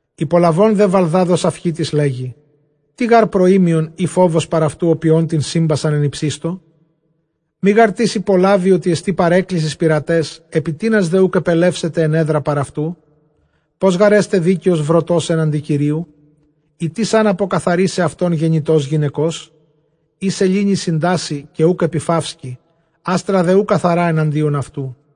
Ὑπολαβὼν δὲ Βαλδὰδ ὁ Σαυχίτης, λέγει, Τί γὰρ προοίμιον ἢ φόβος παρʼ αὐτοῦ ὁ ποιῶν τὴν σύμπασαν ἐν ὑψιστῳ; Μὴ γάρ τις ὑπολάβοι ὅτι ἐστὶ παρέλκυσις πειραταῖς· ἐπὶ τίνας δὲ οὐκ ἐπελεύσεται ἔνεδρα παρʼ αὐτοῦ; Πῶς γὰρ ἔσται δίκαιος βροτὸς ἔναντι Κυρίου; ἢ τίς ἂν ἀποκαθαρίσαι αὐτὸν γεννητὸς γυναικός; Εἰ σελήνῃ συντάσσει, καὶ οὐκ ἐπιφαύσκει, ἄστρα δὲ οὐ καθαρὰ ἐναντίον αὐτοῦ.